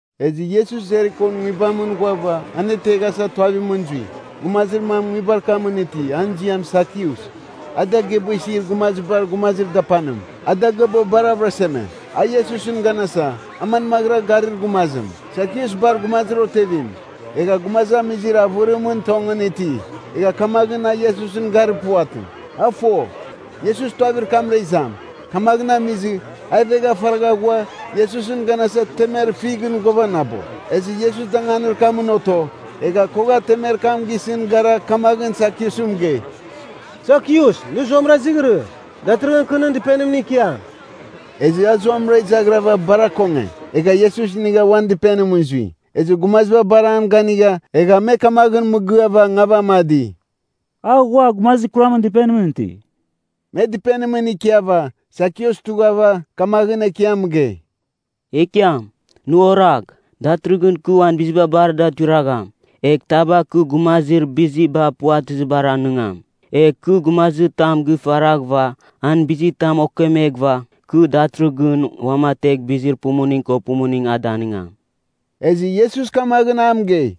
Ezɨ Iesus Jerikon nguibamɨn ghuava, aneteghasa tuavimɨn zui. Gumazir mam nguibar kamɨn iti, an ziam Sakius. A dagɨaba isir gumazibar gumazir dapanim, a dagɨaba bar avɨraseme. A Iesusɨn ganasa, a manmaghɨra garir gumazim. Sakius bar gumazir otevim, egha gumazamizir avɨrimɨn tongɨn iti. Egha kamaghɨn a Iesusɨn garir puvatɨ. A fo, Iesus tuavir kamra izam. Kamaghɨn amizɨ, a ivegha faragha ghua, Iesusɨn ganasa temer fighɨn ghuavanabo. Ezɨ Iesus danganir kamɨn oto. Egha kogha temer kam gisɨn gara, kamaghɨn Sakiusɨn mɨgei, “Sakius nɨ zuamɨra izighirɨ. Datɨrɨghɨn kɨ nɨn dɨpenimɨn ikiam.” Ezɨ a zuamɨra izaghrɨghava, bar akonge. Egha Iesus inigha uan dɨpenimɨn zui. Ezɨ gumaziba bar an ganigha, egha me kamaghɨn mɨgɨava ngavamadi, “A ghua gumazir kuramɨn dɨpenimɨn iti.” Me dɨpenimɨn ikiava, Sakius tughava, kamaghɨn Ekiam mɨgei, “Ekiam, Nɨ oragh! Datɨrɨghɨn kɨ uan biziba bar da tuiragham. Egh taba kɨ gumazir biziba puvatɨzibar anɨngam. Egh kɨ gumazir tam gifaraghɨva, an bizitam okemeghɨva, kɨ datɨrɨghɨn uamategh bizir pumuning ko pumuning a danɨngam.” Ezɨ Iesus kamaghɨn a mɨgei,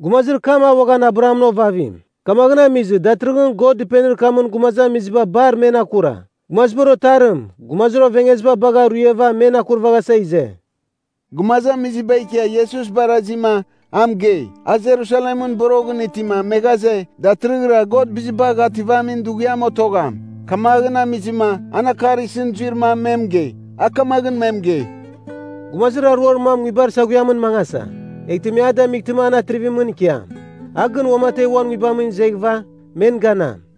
“Gumazir kam a uaghan Abrahamɨn ovavim. Kamaghɨn amizɨ, datɨrɨghɨn God dɨpenir kamɨn gumazamiziba bar men akura. Gumazibar Otarim, gumazir ovengeziba bagha ruiava men akurvaghasa ize.” Gumazamiziba ikia Iesus barazima, a mɨgei. A Jerusalemɨn boroghɨn itima, me ghaze, datɨrɨghɨra God Bizibagh Ativamin Dughiam otogham. Kamaghɨn amizɨma, an akar isɨn zuir mam me mɨgei. A kamaghɨn me mɨgei, “Gumazir aruar mam nguibar saghuiamɨn mangasa, eghtɨ me a damightɨma an atrivimɨn ikiam. A gɨn uamategh uan nguibamɨn izeghɨva, men ganam.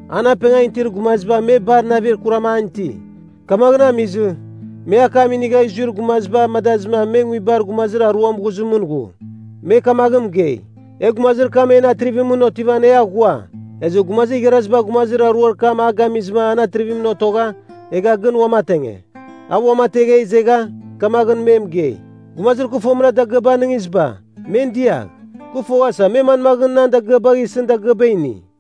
“An apengan itir gumaziba me bar navir kuram an iti. Kamaghɨn amizɨ, me akam inigha zuir gumaziba amadazɨma me nguibar gumazir aruam ghuzɨmɨn ghu. Me kamaghɨn mɨgei, ‘E gumazir kam en atrivimɨn otivan, e aghua.’ Ezɨ gumazir igharaziba gumazir aruar kam a gamizɨma an atrivimɨn otogha, egha gɨn uamatenge. A uamategha izegha, kamaghɨn me mɨgei, ‘Gumazir kɨ fomɨra dagɨaba anɨngiziba, men diagh. Kɨ foghasa me manmaghɨn nan dagɨabagh isɨn dagɨaba ini.’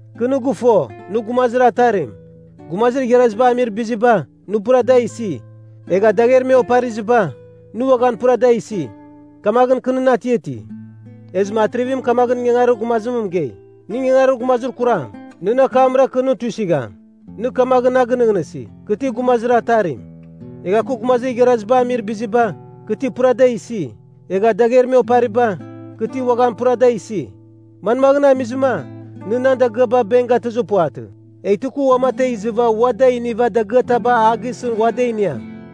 Kɨ nɨ gɨfo, nɨ gumazir atarim. Gumazir igharaziba amir biziba, nɨ pura da isi. Egha dagher me opariziba, nɨ uaghan pura da isi. Kamaghɨn kɨ nɨn atiati.’ “Ezɨma atrivim kamaghɨn ingangarir gumazim mɨgei, ‘Nɨ ingangarir gumazir kuram! Nɨn akamra kɨ nɨ tuisɨgham. Nɨ kamaghɨn na gɨnɨghnɨsi, kɨ ti gumazir atarim. Egha kɨ gumazir igharaziba amir biziba, kɨ ti pura da isi. Egha dagher me opariba, kɨ ti uaghan pura da isi? Manmaghɨn amizɨma, nɨ nan dagɨaba benk gatɨzɨ puvatɨ, eghtɨ kɨ uamategh izɨva ua da iniva dagɨataba a gisɨn ua da iniam?’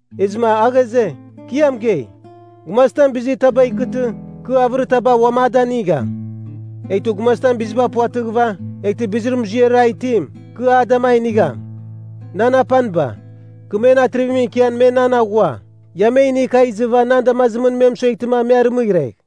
“Ezɨma a ghaze, ‘Kɨ ia mɨgei! Gumazitam bizir taba ikɨtɨ, kɨ avɨritaba uam a danigham. Eghtɨ gumazitam biziba puvatɨghɨva, eghtɨ bizir muziarim a itim, kɨ ada da inigham. Nan apaniba, kɨ men atrivimɨn ikian me nan aghua, ia me inigh kagh izɨva nan damazimɨn me mɨsueghtɨ me arɨmɨghregh.’”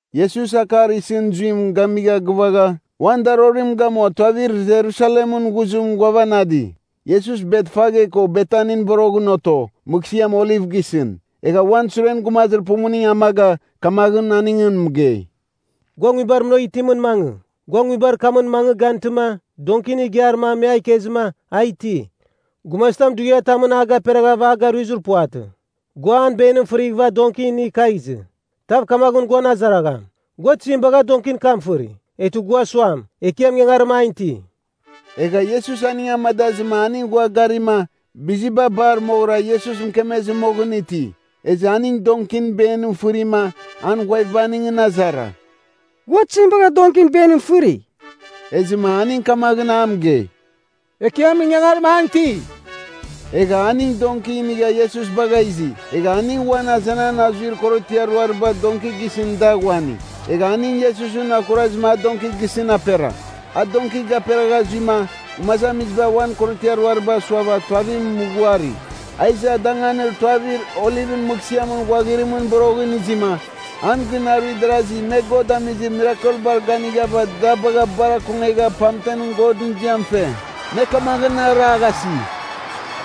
Iesus akar isɨn zuim gamigha gɨvagha, uan darorim gamua tuavir Jerusalemɨn ghuzim ghuavanadi. Iesus Betfage ko Betanin boroghɨn oto, mɨghsɨam Oliv gisɨn. Egha uan suren gumazir pumuning amaga, kamaghɨn aningɨn mɨgei, “Gua nguibar munagh itimɨn mangɨ. Gua nguibar kamɨn mangɨ gantɨma donkin igiar mam me a ikezɨma, a iti. Gumazitam dughiatamɨn a gaperaghava aruizir puvatɨ. Gua an benim fɨrighɨva donki inigh kagh izɨ. Tav kamaghɨn guan azaragham, ‘Gua tizim bagha donkin kam fɨri?’, eghtɨ gua suam, ‘Ekiam ingangarim an iti.’” Egha Iesus aning amadazɨma aning ghua garima, biziba bar moghɨra Iesus mɨkemezɨ moghɨn iti. Ezɨ aning donkin benim fɨrima, an ghuaviba aningɨn azara, “Gua tizim bagha donkin benim fɨri?” Ezɨma aning kamaghɨn a mɨgei, “Ekiam ingangarim an iti.” Egha aning donki inigha Iesus bagha izi. Egha aning uan azenan azuir korotiar ruariba donki gisɨn da ghuani. Egha aning Iesusɨn akurazɨma a donki gisɨn apera. A donki gaperagha zuima, gumazamiziba uan korotiar ruariba suava tuavim mɨghuari. A iza danganir tuavir Olivɨn mɨghsɨamɨn ghuaghirimɨn boroghɨn izima, an gɨn aruir darazi me God amizir mirakelbar ganighava da bagha bar akongegha pamtem Godɨn ziam fe. Me kamaghɨn araghasi,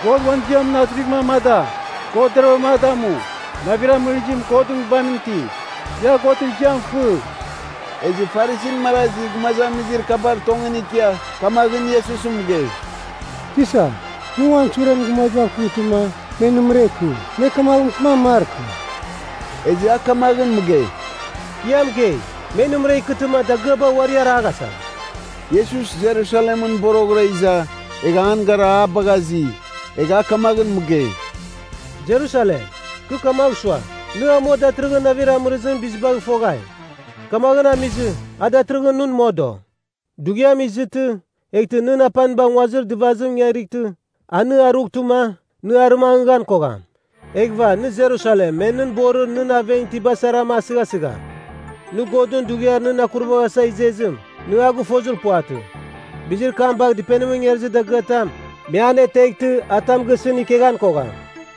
“God uan ziamɨn atrivim amada! God deravɨra a damu! Navir amɨrizim Godɨn Nguibamɨn iti. Ia Godɨn ziam fɨ!” Ezɨ Farisin marazi gumazamizir kabar tongɨn ikia, kamaghɨn Iesusɨn mɨgei, “Tisa, nɨ uan suren gumazibav kɨmtɨma, me nɨmɨra ikɨ! Me kamaghɨn mɨkɨman markɨ!” Ezɨ a kamaghɨn mɨgei, “Kɨ ia mɨgei, me nɨmɨra ikɨtɨma dagɨaba uari araghasam!” Iesus Jerusalemɨn boroghɨra iza, egha an gara a bagha azi. Egha a kamaghɨn mɨgei, “Jerusalem, kɨ kamagh sua, nɨ amua datɨrɨghɨn navir amɨrizɨmɨn bizibagh foghai. Kamaghɨn amizɨ, a datɨrɨghɨn nɨn modo. Dughiam izɨtɨ, eghtɨ nɨn apaniba nguazir dɨvazim ingarightɨ, a nɨ arughtɨma, nɨ arɨmangɨghan kogham. Eghɨva nɨ Jerusalem me nɨn borir nɨn aven itiba sarama asɨghasigham. Nɨ Godɨn dughiar nɨn akuraghasa izezim, nɨ a gɨfozir puvatɨ. Bizir kam bagh dɨpenimɨn ingarizir dagɨatam, me aneteghtɨ, a tam gisɨn keghan kogham.”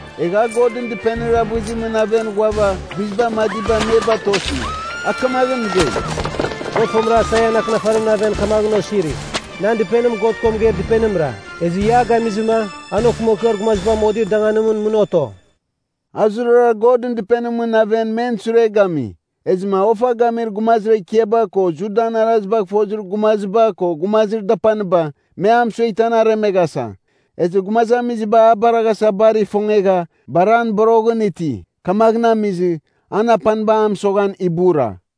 Egha a Godɨn Dɨpenir avɨzimɨn aven ghuava, biziba amadiba me batosi. A kamaghɨn mɨgei, “God fomɨra Aisaian akɨnafarimɨn aven kamaghɨn osiri, ‘Nan dɨpenim God ko mɨgeir dɨpenimra, ezɨ ia a gamizɨma, an okɨmakɨar gumaziba modir danganimɨn mɨn oto.’” A zurara Godɨn Dɨpenimɨn aven men sure gami. Ezɨma ofa gamir gumazir ekiaba ko Judan arazibagh fozir gumaziba ko gumazir dapaniba, me a mɨsueghtɨ an aremeghasa. Ezɨ gumazamiziba a baraghasa bar ifongegha, bar an boroghɨn iti. Kamaghɨn amizɨ, an apaniba a mɨsoghan ibura.